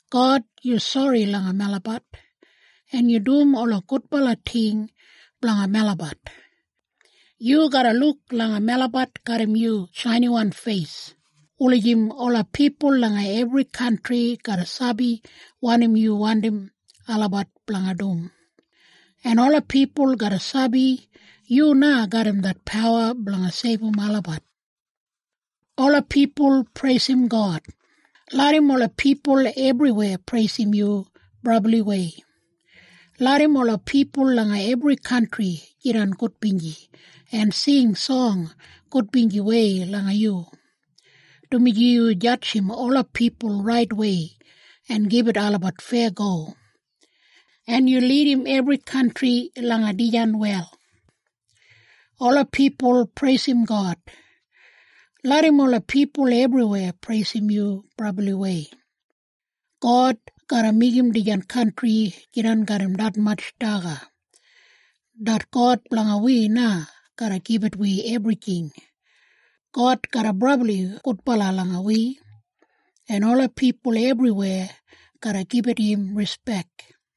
God, yu sori langa melabat, en yu dum ola gudbala ting blanga melabat. Yu garra luk langa melabat garram yu shainiwan feis, wulijim ola pipul langa ebri kantri garra sabi wanim yu wandim olabat blanga dum, en ola pipul garra sabi yu na garram det pawa blanga seibum olabat. Ola pipul preisim God! Larram ola pipul ebriweya preisim yu brabliwei. Larram ola pipul langa ebri kantri jidan gudbinji en sing song gudbinjiwei langa yu, dumaji yu jadjim ola pipul raitwei en gibit olabat feyago, en yu lidim ebri kantri langa dijan wel. Ola pipul preisim God! Larram ola pipul ebriweya preisim yu brabliwei. God garra meigim dijan kantri jidan garram detmatj daga. Det God blanga wi na garra gibit wi ebrijing. God garra brabli gudbala langa wi, en ola pipul ebriweya garra gibit im rispek.